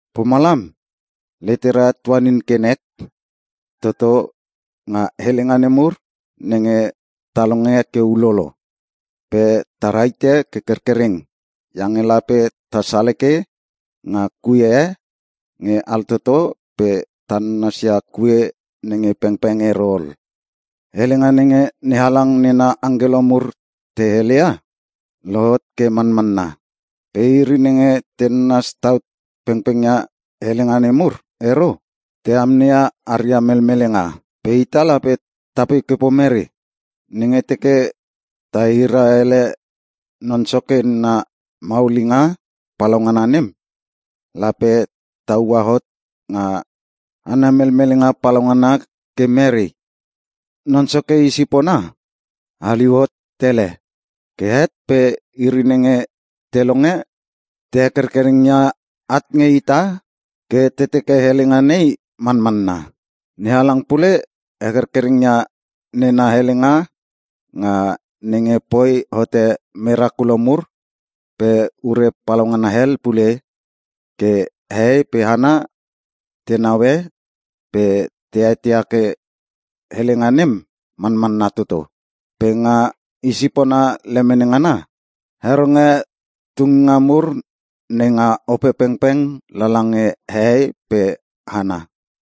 Pomalam, letera tuanin ke nek toto nga helenga nemur nenge ta longe ke ulolo. Pe ta rahite ke kerkereng iange lape ta saleke nga kue e nge altoto pe ta nanasia kue nenge pengpeng ero ol. Helenga nenge NeHalang nena angkelo mur te heleia, lohot ke manmanna. Pe iri nenge te nanas tau pengpengia helenga nemur ero, te amneia aria melmelenga. Pe ita lape tapoi ke pomere? Nenge teke ta hira ele Non Soke nena maulinga palaungana nem, lape ta ua hot nga ana melmelenga palaungana ke mere? Non Soke i sipona haliu hot tele. Ke het pe iri nenge te longe, te hekerkereng ia at nge ita ke te teke helenga nei manmanna. NeHalang pule hekerkereng ia nena helenga nga nenge poi hote merakulo mur pe ure papalauna hel pule ke hehei pe hana te neue pe te eteia ke helenga nem manmanna toto. Pe nga I sipona lemene ngana, heronge tunginga mur nenga Opepengpeng lala nge hehei pe hana.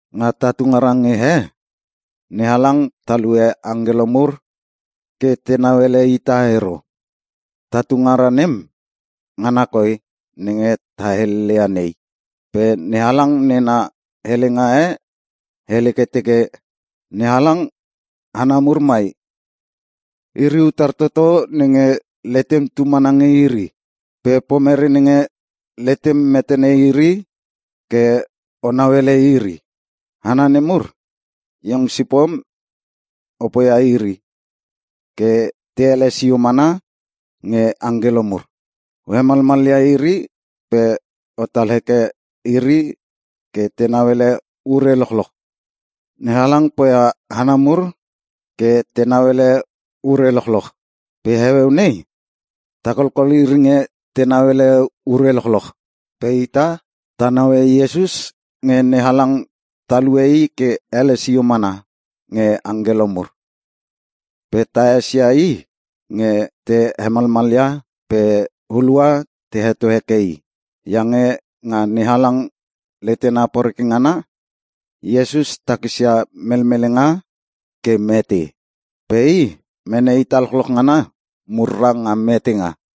Nga tatu ngara nge he, NeHalang talue angkelo mur ke te nauele ita ero. Ta tungara nem, ngana koi nenge ta heleleia nei. Pe NeHalang nena helenga e hele ke teke, “NeHalang, hana mur mai, iri utar toto nenge letem tu mana nge iri? Pe pomere nenge letem metene iri ke o nauele iri? Hana nemur, iong sipom o poia iri ke te ele sio mana nge angkelo mur. O hemalmalia iri pe otal heke iri ke tenau ele ure lochloch.” NeHalang poia hana mur ke tenau ele ure lochloch. Pe heueu nei ta kolkol iri nge tenau ele ure lochloch. Pe ita, ta naue Iesus nge NeHalang talue i ke ele sio mana nge angkelo mur. Pe ta esia i nge te hemalmalia pe hulua te heto heke i. Iange nga NeHalang letena poreke ngana, Iesus takisia melmelenga ke mete. Pe i mene ita lochloch ngana murra nga metenga.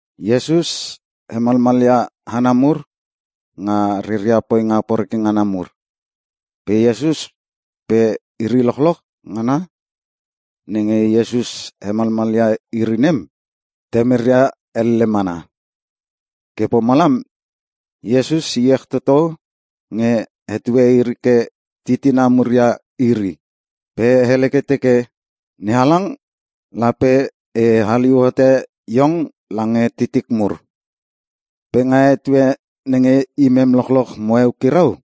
Iesus helemlemia hana mur nga reria poinga poreke ngana mur. Pe Iesus pe iri lochloch ngana nenge Iesus helemlemia iri nem, temeria elle mana. Ke pomalam Iesus iech toto nge hetue iri ke titina mur ia iri. Pe hele ke teke, “NeHalang, Lape e haliu hote iong lange titik mur. Pe nga etue nenge imem lochloch mo eukirau,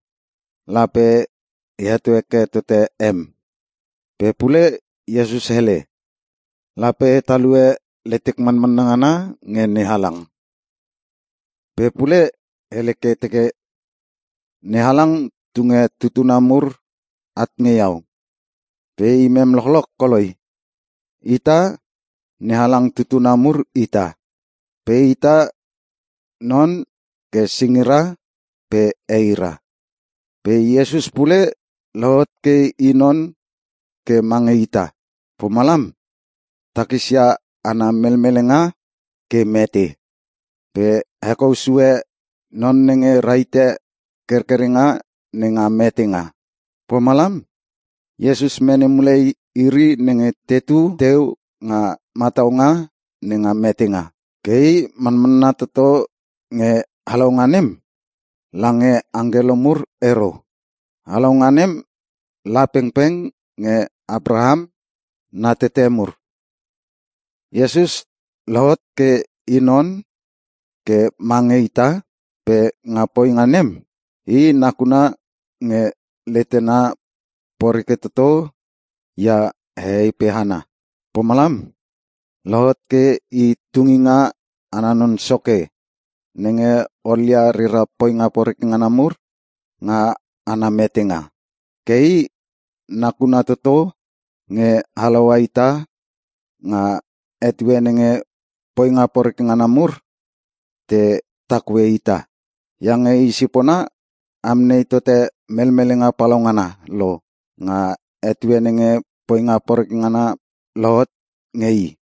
lape e heto heke tote em.” Pe pule Iesus hele, “Lape e talue letek manmanna ngana nge NeHalang.” Pe pule hele ke teke, “NeHalang tunge tutuna mur at nge iau. Pe imem lochloch koloi.” Ita, NeHalang tutuna mur ita. Pe ita non ke singira pe eira. Pe Iesus pule lohot ke i non ke mange ita. Pomalam, takisia ana melmelenga ke mete, pe hekou sue non nenge rahite kerkerenga nenga metenga. Pomalam, Iesus mene mule iri nenge tetu teu nga mataunga nenga metenga. Ke i manmanna toto nge halaunga nem, lange angkelo mur ero. Halaunga nem la pengpeng nge Apraham na tete mur. Iesus lohot ke i non ke mange ita pe nga poinga nem, i nakuna nge letena poreke toto ia hehei pe hana. Pomalam, lohot ke I Tunginga Ana Non Soke nenge olia reria poinga poreke ngana mur nga ana metenga. Ke i nakuna toto nge halaua ita nga etue nenge poinga poreke ngana mur te takue ita. Iange i sipona amnei tote melmelenga palaungana lo nga etue nenge poinga poreke ngana lohot nge i.